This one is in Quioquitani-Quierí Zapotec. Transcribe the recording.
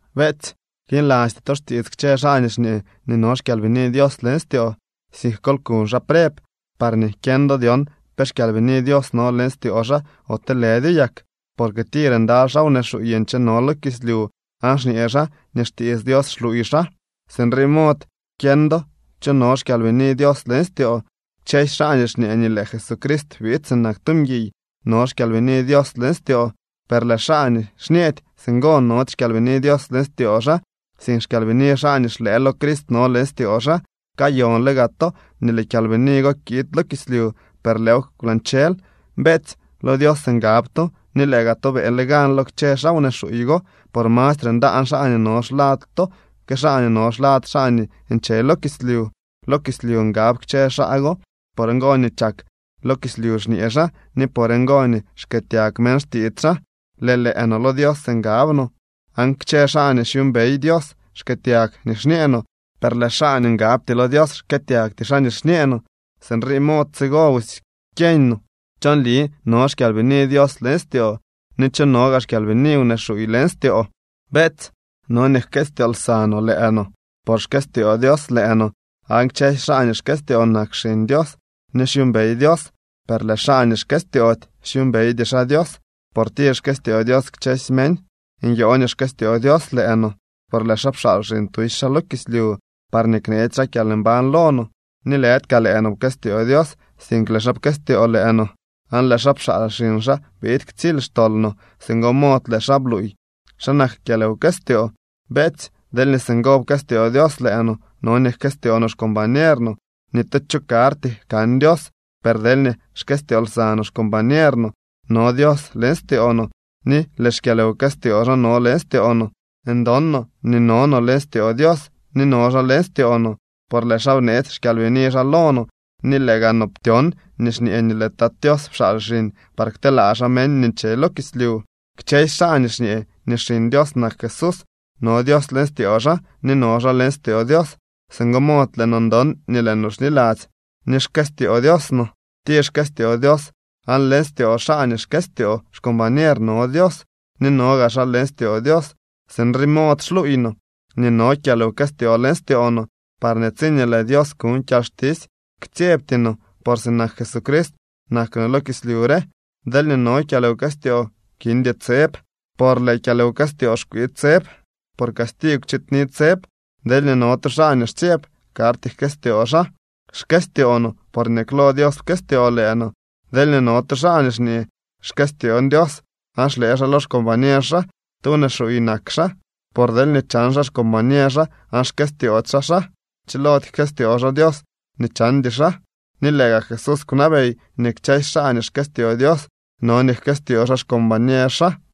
Beetsy, knilasty to xtiits kchë xaa nii xñee nii no xKyalbini Dios leñ styoo, sink kol kuñ xaa preb, parñee kyeñ do dyon pe xKyalbini Dios no leñ styoo xaa ote lëdyo yak. Porque tir ndaly xaa wnee xuuy ncheno lo kislyu aan xñee xaa nii xtiits Dios xluuy xaa. Sinrii mod kyeñ do cho no xKyalbini Dios leñ styoo: kchësy xaa nii xñee nii lëë Jesucrist biid sinak tu mguiy no xKyalbini Dios leñ styoo. Per lëë xaa nii xñeedy singo nody xKyalbini Dios leñ styoo xaa, sink xkyalbini xaa nii xlëë lo Crist no leñ styoo xaa. Kayonle gaa to nii lëë kyalbini go kiid lo kislyu, per lëëw kwlañchel. Beetsy, lo Dios ngab to ni lëë gaa to beeñle gan lo kchë xaa wnee xuuy go. Por mastre ndaan xaa nii no xlad to que xaa nii no xlad xaa nii nche lo kislyu. Lo kislyu ngab kchë xaa go. Por ngo nii chak lo kislyu xñee xaa ni por ngo nii xkëëtyag meñ xtiits xaa. Lëë lëë no lo Dios ngab no, aan kchë xaa nii xyuumbey Dios xkëëtyag nii xñee no, per lëë xaa nii ngabty lo Dios xkëëtyagty xaa nii xñee no. Sinrii mod tsigo busy kyeeñ no cho nli no xKyalbini Dios leñ styoo, ni cho no gaa xkyalbini wnee xuuy leñ styoo. Beetsy, no nii jkëstyoo lsa no lëë no, por xkëstyoo Dios lëë no. Aan kchësy xaa nii xkëstyoo nak xiñ Dios ni xyuumbey Dios. Per lëë xaa nii xkëstyoody xyuumbeydy xaa Dios, por tir xkëstyoo Dios kchësy meñ. Nyoo nii xkëstyoo Dios lëë no por lëë xaa pxaal xiñ tusy xaa lo kislyu parñee kneetsy xaa kyalmbañ lo no. Ni lëdy kaa lëë no pkëstyoo Dios, sink lëë xaa pkëstyoo lëë no, aan lëë xaa pxaal xiñ xaa biid ktsily xtol no. Singo mod lëë xaa bluuy xa nak kyalwkëstyoo. Beetsy, deelñee singo pkëstyoo Dios lëë no, no nii jkëstyoo no xcombañer no. Ni tu cho karty kan Dios, per deelñee xkëstyoo lsa no xcombañer no, no Dios leñ styoo no ni lëë xkyalwkëstyoo xaa no leñ styoo no. Ndon no nii no no leñ styoo Dios ni no xaa leñ styoo no por lëë xaa bneetsy xKyalbini xaa lo no. Ni lëë gaa no ptyon ni xñee nii lëë Tat Tios pxaal xiñ par kteelaa xaa meñ nii nche lo kislyu. Kchësy xaa nii xñee nii Xiñ Dios nak Jesús, no Dios leñ styoo xaa ni no xaa leñ styoo Dios. Singo mod lëë no ndon ni lëë no xniladzy nii xkëstyoo Dios no. Tir xkëstyoo Dios, aan leñ styoo xaa nii xkëstyoo xcombañer no Dios ni no gaa xaa leñ styoo Dios. Sinrii mod xluuy no nii no kyalwkëstyoo leñ styoo no, parñee tsiñee lëë Dios kuñ kyalxtisy ktsyebty no, por sinak Jesucrist nak no lo kislyu re. Deelñee no kyalwkëstyoo kindy tseb. Por lëë kyalwkëstyoo xkwii tseb, por castigw chiidni tseb. Deelñee no tu xaa nii xtsyeb, karty jkëstyoo xaa. Xkëstyoo no porñee klo Dios pkëstyoo lëë no. Deelñee no tu xaa nii xñee: “Xkëstyoon Dios”, aan xlëë xaa lo xcombañer xaa, tu wnee xuuy nak xaa, por deelñee chan xaa xcombañer xaa aan xkëstyoody xaa xaa, chilody jkëstyoo xaa Dios nii chandy xaa. Ni lëë gaa Jesús kwnabey nii kchësy xaa nii xkëstyoo Dios no nii jkëstyoo xaa xcombañer xaa.